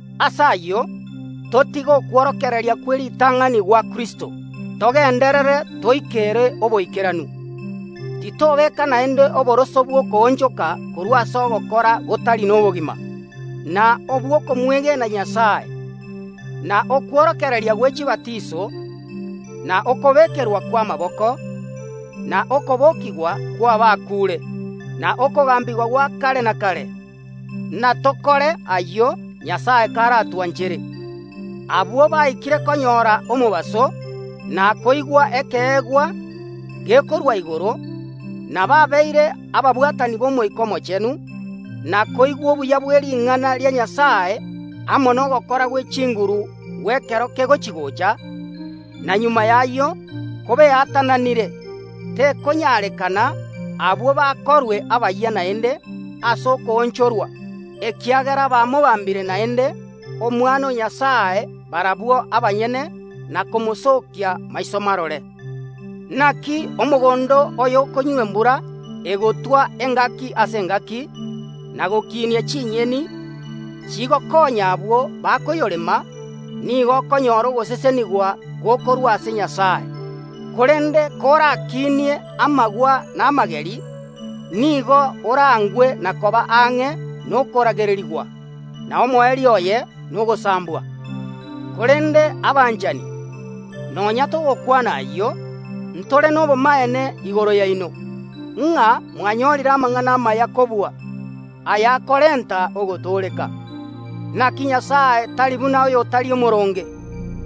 Ase ayio, totige okworokereria kw’eritang’ani gwa Kristo, togenderere toikere oboikeranu. Titobeka naende oboroso bw’okoonchoka korwa ase ogokora gotari nobogima, na obw’okomwegena Nyasae, na okworokereria gwe chibatiso, na okobekerwa kw’amaboko, na okobokigwa kw’abakuure, na okogambigwa gwa kare na kare. Natokore ayio, Nyasae karatwanchere. Abwo baikire konyora omobaso, na koigwa ekeegwa gekorwa igoro, na babeire ababwatani b’Omoika Omochenu, na koigwa obuya bw’ering’ana ria Nyasae amo nogokora gwe chinguru gw’ekero kegochi‐gocha, na magega y’ayio kobeatananire, tekonyarekana abwo bakorwe abayia naende ase okoonchorwa, ekiagera bamobambire naende Omwana o Nyasae barabwo abanyene, na komosookia maiso marore. Naki omogondo oyokonywa embura egotwa engaki ase engaki, na gokinia chinyeni, chigokonya abwo bakoyorema, nigo okonyora ogosesenigwa gokorwa ase Nyasae. Korende korakinie amagwa na amageri, nigo oraangwe na koba ang’e nokorangererigwa, na omoerio oye nogosambwa. Korende abanchani, nonya togokwana ayio, ntore nobomaene igoro yaino, ng’a mwanyorire amang’ana amaya kobua, ayakorenta ogotooreka. Naki Nyasae tari buna oyotari omooronge,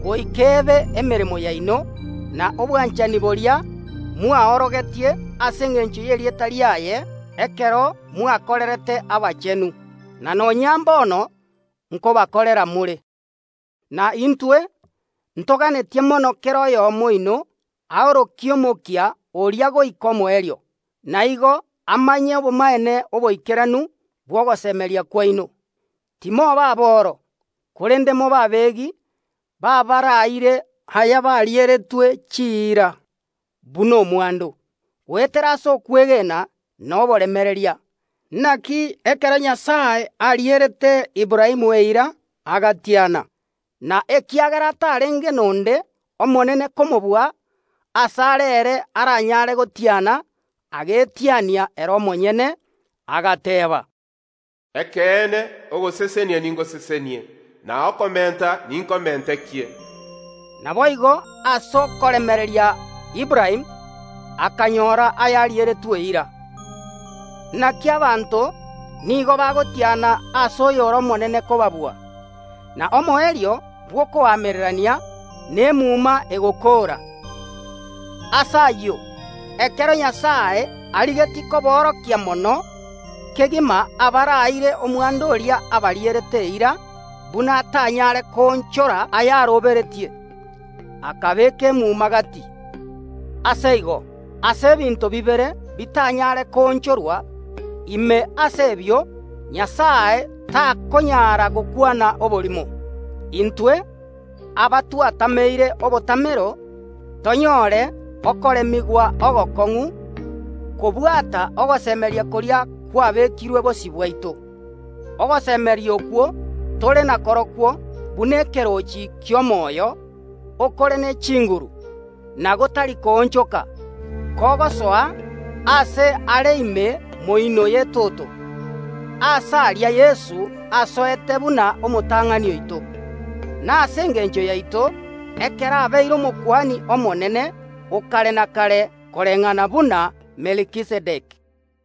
goika ebe emeremo yaino, na obwachani boria mwaorogetie ase engencho y’erieta riaye ekero mwakorerete abachenu, na nonya mbono nkobakorera more. Na intwe ntoganetie mono kera oyomo oino aorokie omokia oria goika omoerio, na igo amanye obomaene oboikeranu bw’ogosemeria kwaino. Timoba aboro, korende mobe abegi b’abaraire ayabarieretwe chiira, buna omwando, goetera ase okwegena na oboremereria. Naki ekero Nyasae arierete Aburaamu eira agatiana; na ekiagera atarenge nonde omonene komobua asare ere aranyare gotiana, agetiania ere omonyene, agateeba, “Ekeene, ogosesenia ningosesenie, na okomenta ninkomentekie.” Naboigo ase okoremereria Aburaamu akanyora ayarieretwe eira. Naki abanto nigo bagotiana ase oyore omonene kobabua, na omoerio bw’okoamererania nemuma egokoora. Ase ayio, ekero Nyasae arigetie koborokia mono kegima abaraire omwando oria abarierete eira buna atanyare koonchora ayaroberetie, akabeeka emuma gati. Ase igo, ase ebinto bibere bitanyare koonchorwa, ime ase ebio Nyasae takonyara gokwana oborimo, intwe, abatwatameire obotamero, tonyore okoremigwa ogokong’u kobwata ogosemeria koria kwabekirwe bosio bwaito. Ogosemeria okwo tore nakorokwo buna ekeroochi ki’omoyo, okore ne chinguru, na gotari koonchoka, kogosoa aase are ime moino y’etoto. Aase aria Yeso asoete buna omotang’ani oito, na ase engencho yaito, ekero abeire Omokuani Omonene o kare na kare, koreng’ana buna Melkizedeki.